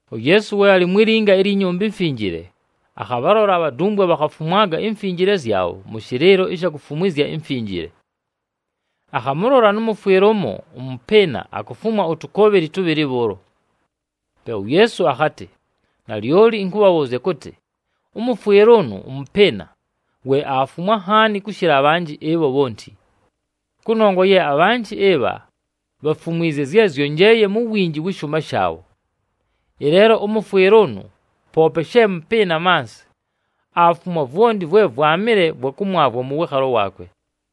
UYeesu we alɨ mwi linga ilyi Nyumba iMfinjile, akhabhalola abhadumbwe bhakhafumwaga imfinjile zyabho mʉ shɨlɨɨlo ɨsha kufumwizya imfinjile. Akhamʉlola nʉ mʉfwɨle ʉmo ʉmʉpɨɨna akufumwa utukoobheli tʉbhɨlɨ bhʉʉlo. Pe uYeesu akhatɨ, “Nalyoli ɨnkʉbhabhʉʉzya kʉtɨ, ʉmʉfwɨle ʉnʉ ʉmʉpɨɨna, we aafumwa nhaani kʉshɨla abhanjɨ ɨbho bhonti. Kʉnongwa ye abhanjɨ ɨbha, bhafumwizye zye zyonjeleeye mu winji wɨ shʉʉma shaabho. Ɨleelo ʉmʉfwɨle ʉnʉ poope she mʉpɨɨna mansɨ, aafumwa vwonti vwe vwamɨle vwa kʉmwavwa mʉ wɨɨkhalo waakwe!”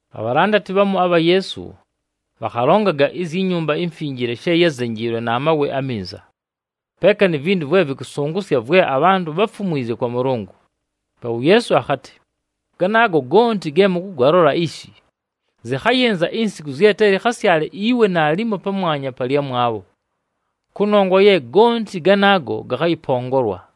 Abhalandati bhamu abha Yeesu, bhakhalongaga izyi Nyumba iMfinjile she yázenjiilwe na mawe aminza, peeka ni vintu vwe vɨkʉsʉngʉsya vwe abhantʉ bháfumwizye kwa Mʉlʉngʉ. Pe uYeesu akhatɨ, “Ganaago gonti ge mʉkʉgalola ishi, zɨkhayɨnza insiku zye te lɨkhasyale iwe naalimo pamwanya pa lyamwabho, kʉnongwa ye gonti ganaago gakhayɨpongolwa!”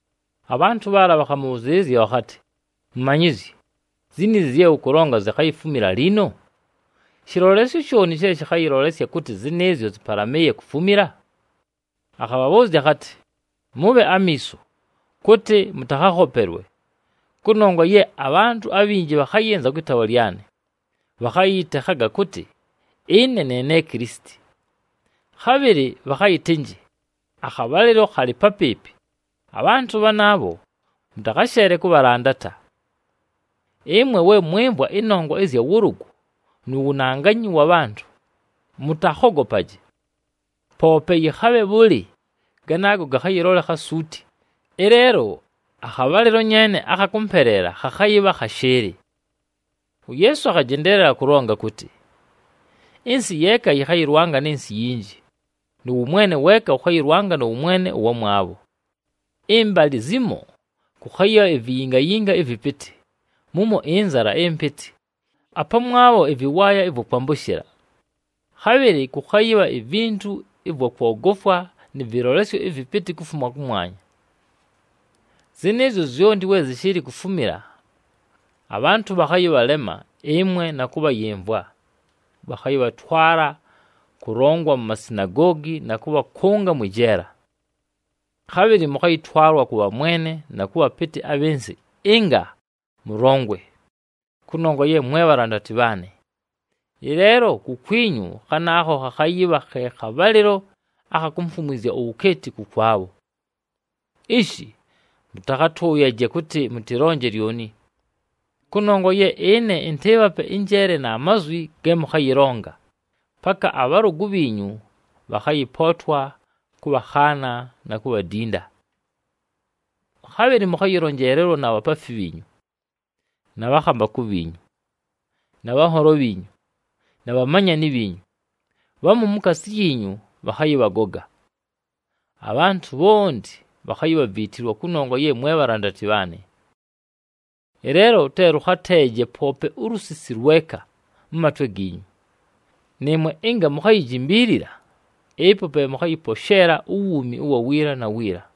Abhantʉ bhaala bhakhamʉbhʉzɨɨlɨzya bhakhatɨ, “Mumanyizyi, ziniizi zye ʉkʉlonga zikhayifumila liino? Shɨlolesyo shooni she shɨkhayɨlolesya kʉtɨ zɨnɨɨzyo zɨpalamɨɨye kufumila?” Akhabhabhʉʉzya akhatɨ, “Mʉbhe amiiso, kʉtɨ mʉtakhakhopelwe! Kʉnongwa ye abhantʉ abhinji bhakhayɨnza kwɨ taawa lyanɨ, bhakhayɨyɨtekhaga kʉtɨ, ‘Ɨne ne ne Kilisiti!’ Khabhɨlɨ bhakhayɨtɨnjɨ, ‘Akhabhalɨlo khalɨ papɨɨpɨ!’ Abhantʉ bhanaabho, mʉtakhasheele kʉbhalandata! Ɨmwe we mwɨmvwa ɨnongwa ɨzya wʉlʉgʉ, nu wunanganyi wa bhantʉ, mʉtakhogopaje. Poope yɨkhabhe bhʉlɨ ganaago gakhayɨlolekha suuti, ɨleelo akhabhalɨlo nyeene akha kʉmpeleela khakhayɨbha khashɨɨlɨ.” UYeesu akhajendeelela kʉlonga kʉtɨ, “Ɨnsɨ yeeka yɨkhayɨlwanga nɨ nsɨ iyinji, nʉ wʉmwene weeka wʉkhayɨlwanga nʉ wʉmwene ʉwamwabho. Ɨmbalɨ zimo kʉkhayɨbha iviyingayinga ɨvɨpɨtɨ, mumo ɨnzala ɨmpɨtɨ, apamwabho ɨvɨwaaya ɨvwa kwambʉshɨla. Khabhɨlɨ kʉkhayɨbha ivintu ɨvwa kwogofwa nɨ vɨlolesyo ɨvɨpɨtɨ kufuma kʉmwanya. “Zɨnɨɨzyo zyonti we zɨshɨɨlɨ kufumila, abhantʉ bhakhayɨbhalema ɨmwe na kʉbhayɨmvwa. Bhakhayɨbhatwala kʉlongwa mu masinagoogi, na kʉbhakʉnga mwɨ jeela. Khabhɨlɨ mʉkhayɨtwalwa kʉ bhamwene na kʉ bhapɨtɨ abhɨ nsɨ ɨnga mʉlongwe, kʉnongwa ye mwe bhalandati bhaanɨ. Ɨleelo kukwinyu khanaakho khakhayɨbha khe khabhalɨlo akha kumfumwizya uwukeeti kʉkwabho. Ishi, mʉtakhatʉʉyaje kʉtɨ mʉtɨlonje lyoni. Kʉnongwa ye ɨne ɨntɨɨbhape ɨnjeele na mazwi ge mʉkhayɨlonga, paka abhalʉgʉ bhiinyu bhakhayɨpootwa kʉbhakhaana na kubhadinda. “Khabhɨlɨ mʉkhayɨlonjeelelwa na bhapaafi bhiinyu, na bhakhambakʉ bhiinyu, na bhanholo bhiinyu, na bhamanyani bhiinyu, bhamu mukaasi yiinyu bhakhayɨbhagoga. Abhantʉ bhonti, bhakhayibhaviitilwa kʉnongwa ye mwe bhalandati bhaanɨ. Ɨleelo te lʉkhateeje poope ulusisi lweka, mʉ matwe giinyu! Nɨɨmwe ɨnga mukhayijimbiilila, ɨpo pe mʉkhayɨposheela uwuumi ʉwa wiila na wiila.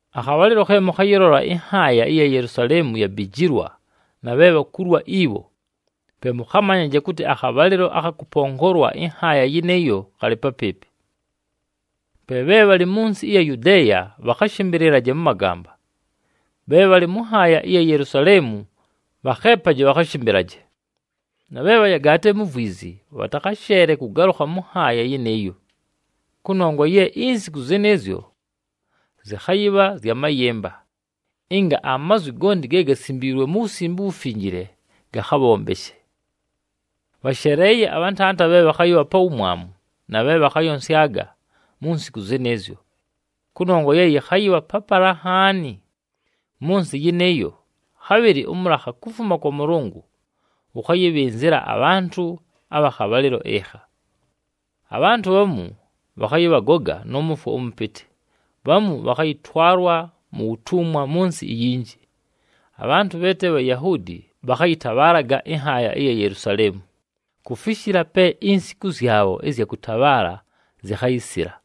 “Akhabhalɨlo khe mʉkhayɨlola ɨnhaaya ɨya Yelusaleemu yabijilwa na bhe bhakulwa ibho, pe mʉkhamanyaje kʉtɨ akhabhalɨlo akha kʉpongolwa ɨnhaaya yɨnɨɨyo khalɨ papɨɨpɨ. Pe bhe bhalɨ mʉ nsɨ ɨya Yudeeya bhakhashɨmbɨlɨlaje mʉ magamba. Bhe bhalɨ mʉ nhaaya ɨya Yelusaleemu, bhakheepaje bhakhashɨmbɨlaje, na bhe bhayagaatile mu vwizi, bhatakhasheele kʉgalʉkha mʉ nhaaya yɨnɨɨyo. Kʉnongwa ye insiku zɨnɨɨzyo zɨkhayɨbha zya mayɨmba, ɨnga mazwi gonti ge gasimbiilwe mu Wusimbe uWufinjile gakhabhombeshe. Bhasheleeye abhantanda bhe bhakhayɨbha pa wumwamu na bhe bhakhayonsyaga mu nsiku zɨnɨɨzyo! Kʉnongwa ye yɨkhayɨbha papala nhaani mʉ nsɨ yɨnɨɨyo, khabhɨlɨ ʉmʉlakha kufuma kwa Mʉlʉngʉ wʉkhayɨbhɨnzɨla abhantʉ abha khabhalɨlo ɨkha. Abhantʉ bhamu, bhakhayɨbhagoga nʉ mʉfwo ʉmʉpɨtɨ, bhamu bhakhayɨtwalwa mu wutumwa mʉ nsɨ inyinji. Abhantʉ bhe te Bhayahuudi, bhakhayɨtabhaalaga ɨnhaaya ɨya Yelusaleemu, kufishila pe insiku zyabho ɨzya kʉtabhaala zikhayisila.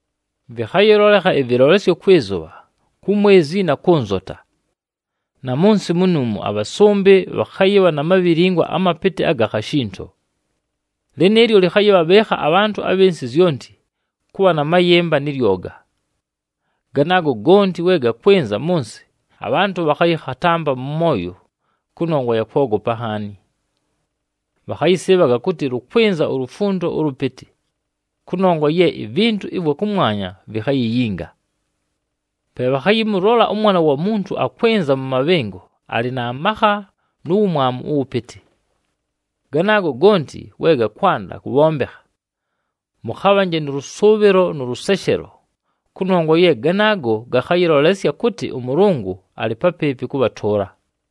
“Vɨkhayɨlolekha ɨvɨlolesyo kwɨ zʉbha, ku mwezi na kʉ nzota. Na mʉ nsɨ munuumu, abhasʉmbɨ bhakhayɨbha na mabhilingwa amapɨtɨ aga khashinto. Lɨnɨɨlyo lɨkhayɨbhabhɨɨkha abhantʉ abhɨ nsɨ zyonti, kʉbha na mayɨmba nɨ lyoga. Ganaago gonti, we gakwɨnza mʉ nsɨ, abhantʉ bhakhayɨkhatampa mʉ mwoyo kʉnongwa ya kwogopa nhaani. Bhakhayɨsɨɨbhaga kʉtɨ lʉkwɨnza ulufundo ʉlʉpɨtɨ, kʉnongwa ye ivintu ɨvwa kʉmwanya vikhayiyinga. “Pe bhakhayɨmʉlola ʉMwana wa Muntu akwɨnza mʉ mabhɨngo alɨ na makha nu wumwamu ʉwʉpɨtɨ. Ganaago gonti, we gakwanda kʉbhombekha, mʉkhabhanje nʉ lʉsʉʉbhɨlo nʉ lʉseshelo, kʉnongwa ye ganaago gakhayɨlolesya kʉtɨ ʉMʉlʉngʉ alɨ papɨɨpɨ kʉbhatʉʉla!”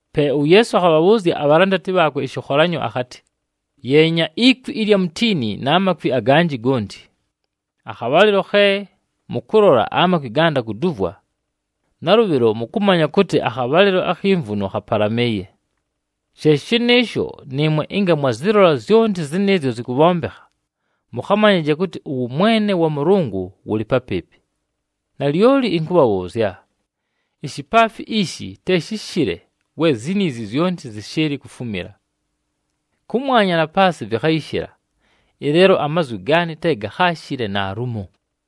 Pe uYeesu akhabhabhʉʉzya abhalandati bhaakwe ɨshɨkholanyo akhatɨ, “Yeenya ikwi ɨlya mutiini na makwi aganjɨ gonti. Akhabhalɨlo khe mʉkʉlola amakwi ganda kuduvwa, nalʉbhɨlo mʉkʉmanya kʉtɨ akhabhalɨlo akhi mvuno khapalamɨɨye. “She shɨnɨɨsho, nɨɨmwe ɨnga mwazɨlola zyonti zɨnɨɨzyo zɨkʉbhombekha, mʉkhamanyaje kʉtɨ ʉwʉmwene wa Mʉlʉngʉ wʉlɨ papɨɨpɨ. Nalyoli ɨnkʉbhabhʉʉzya, ishipaafi ishi te shɨshɨle we ziniizi zyonti zɨshɨɨlɨ kufumila. Kʉmwanya na paasɨ vɨkhayɨshɨla, ɨleelo amazwi gaanɨ te gakhaashɨle naalumo.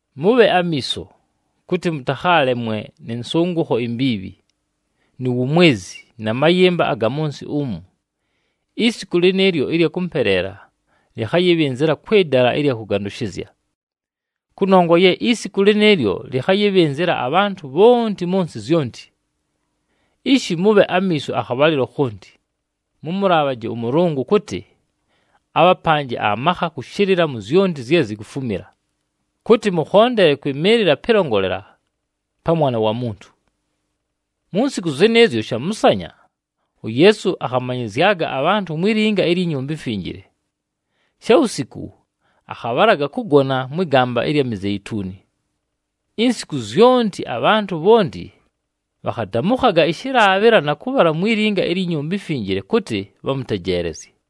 “Mʉbhe amiiso, kʉtɨ mʉtakhaalemwe nɨ nsʉngʉkho imbiibhi, nu wumwezi, na mayɨmba aga mʉ nsɨ umu, isiku lɨnɨɨlyo ɨlya kʉmpeleela lɨkhayɨbhɨnzɨla kwɨ dala ɨlya kʉgandʉshɨzya. Kʉnongwa ye isiku lɨnɨɨlyo lɨkhayɨbhɨnzɨla abhantʉ bhonti mʉ nsɨ zyonti. Ishi, mʉbhe amiiso akhabhalɨlo khonti, mʉmʉlaabhaje ʉMʉlʉngʉ kʉtɨ, abhapanje amakha kʉshɨlɨla mu zyonti zye zikufumila, kʉtɨ mʉkhondele kwɨmɨɨlɨla pɨlongolela pa Mwana wa Muntu.” Mu nsiku zɨnɨɨzyo shamʉsanya, uYeesu akhamanyɨzyaga abhantʉ mwi linga ilyi Nyumba iMfinjile. Shawusiku, akhabhalaga kʉgona mwɨ gamba ɨlya Mizeituni. Insiku zyonti abhantʉ bhonti bhakhadamʉkhaga ɨshɨlaabhɨla, na kʉbhala mwi linga ilyi Nyumba iMfinjile, kʉtɨ bhamʉtejeelezye.